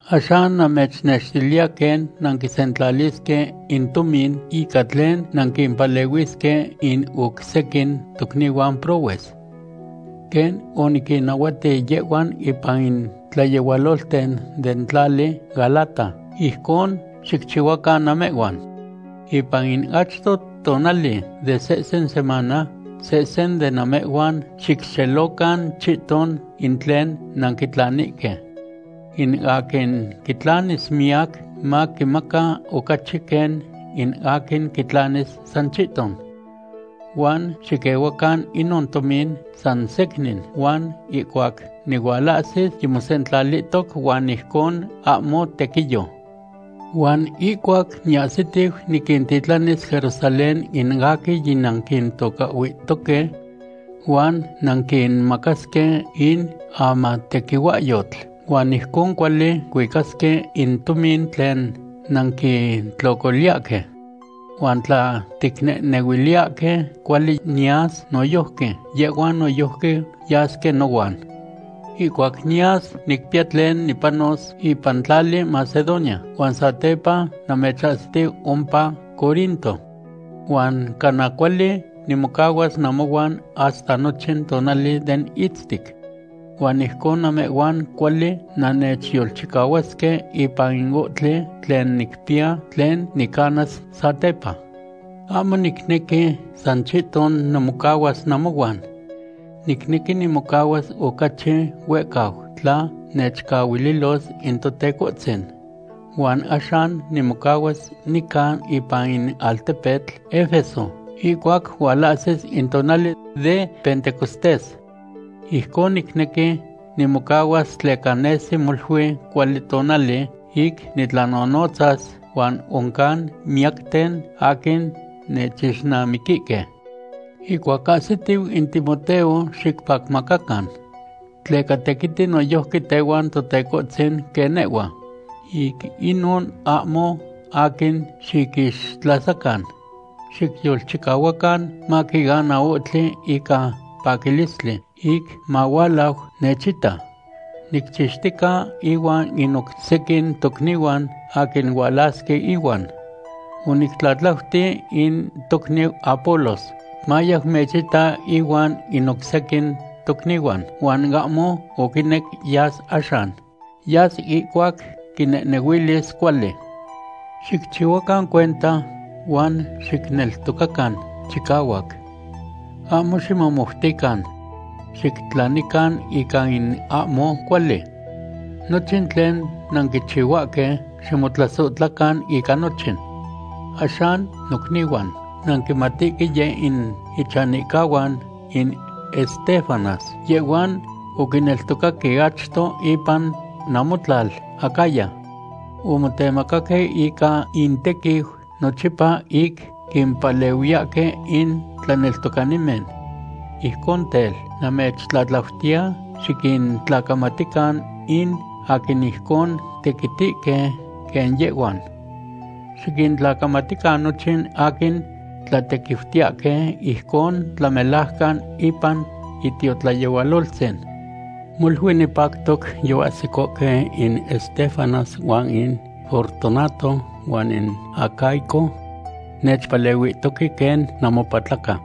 Axan namechnextiliya quen nanquisentlalisque in tomin ica tlen nanquimpalehuisque in oc sequin tocnihuan prohues. Quen oniquinnahuati yehhuan ipan in tlayehualolten den tlali Galata, ijcon xicchihuacan namehhuan. Ipan in achto tonali de sehsen semana, sehsen de namehhuan xicxelocan chihton in tlen nanquitlanihque. In aquin quitlanis miyac maquimaca ocachi quen in aquin quitlanis san chihton. Huan xiquehuacan inon tomin san secnin, huan ihcuac nihualahsis, yimosentlalihtoc huan ijcon ahmo tequiyo. Huan ihcuac niahsitiu, niquintitlanis Jerusalén in aquin yinanquintocahhuihtoque. Huan nanquinmacasque in amatequihuahyotl, huan ijcon cuali cuicasque in tomin tlen nanquitlocoliyahque. Huan tla ticnehnehuiliyahque cuali niyas noyojqui, yehhuan noyojqui yasque nohuan. Ihcuac niyas, nicpiya tlen nipanos ipan tlali Macedonia, huan satepa namechahsitiu ompa Corinto. Huan cana cuali nimocahuas namohuan hasta nochin tonali den itztic. Huan ijcon namehhuan cuali nannechyolchicahuasque ipan in ohtli tlen nicpiya tlen nicanas satepa. Ahmo nicnequi san chihton nimocahuas namohuan. Nicnequi nimocahuas ocachi huehcau tla nechcahuililos in Totecohtzin. Huan axan nimocahuas nica ipan in altepetl Efeso ihcuac hualahsis in tonali de Pentecostés. Ijcon nicnequi nimocahuas tleca nesi molui cuali tonali ic nitlanonotzas huan oncan miyacten aquin nechixnamiquihque. Ihcuac ahsitiu in Timoteo, xicpacmacacan. Tleca tequiti noyojqui tehuan Totecohtzin quen nehhua. Ic inon ahmo aquin xiquixtlasacan. Xicyolchicahuacan maquiana ohtli ica paquilistli ic mahualau nechita. Nicchixtica ihuan in oc sequin tocnihuan aquin hualasque ihuan. Onictlatlauti in tocniu Apolos, mayau mechita ihuan in oc sequin tocnihuan, huan ahmo oquinec yas axan. Yas ihcuac quinehnehuilis cuali. Xicchihuacan cuenta, huan xicneltocacan chicahuac. Ahmo ximomoutican. Xictlanican ica in ahmo cuali. Nochin tlen nanquichihuahque, ximotlasohtlacan ica nochin. Axan nocnihuan, nanquimatihque yeh in ichanihcahuan in Estéfanas, yehhuan oquineltocaque achto ipan namotlal Acaya. Omotemacaque ica intequiu nochipa ic quimpalehuiyahque in tlaneltocanimen. Ijcon tel, namechtlatlautiya xiquintlacamatican in aquin ijcon tequitihque quen yehhuan. Xiquintlacamatican nochin aquin tlatequiutiyahque ijcon tlamelajcan ipan itiotlayehualoltzin. Molui nipactoc yoahsicohque in Estéfanas huan in Fortunato huan in Acaico. Nechpalehuihtoque quen namopatlaca.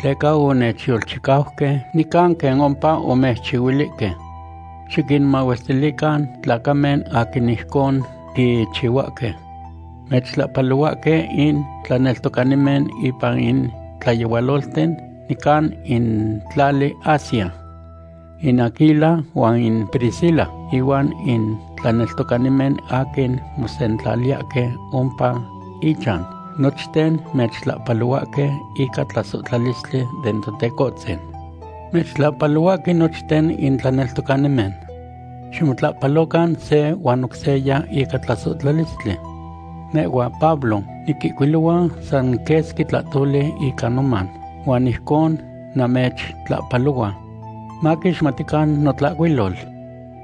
Tleca onechyolchicauque nican quen ompa omechchihuilihque. Xiquinmahuestilican tlacamen aquin ijcon quichihuahque. Mechtlahpalohuahque in tlaneltocanimen ipan in tlayehualolten nican in tlali Asia. In Aquila huan in Priscila inuan in tlaneltocanimen aquin mosentlaliyahque ompa ichan, nochten mechtlahpalohuahque ica tlasohtlalistli den Totecohtzin. Mechtlahpalohuahque nochten in tlaneltocanimen. Ximotlahpalocan se huan oc seya ica tlasohtlalistli. Nehhua, Pablo, niquihcuilohua san quesqui tlahtoli ica noman, huan ijcon namechtlahpalohua. Maquixmatican notlahcuilol.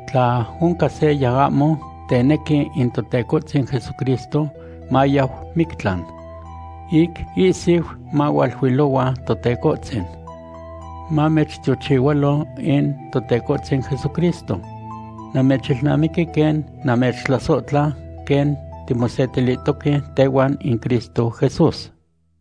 Tla oncan seya ahmo tenequi in Totecohtzin Jesucristo, mayau mictlan. Ic ihsiu mahualuilohua Totecohtzin. Mamechtiochihualo in Totecohtzin Jesucristo. Namechilnamiqui quen namechtlasohtla quen timosetilihtoque tehuan in Cristo Jesús.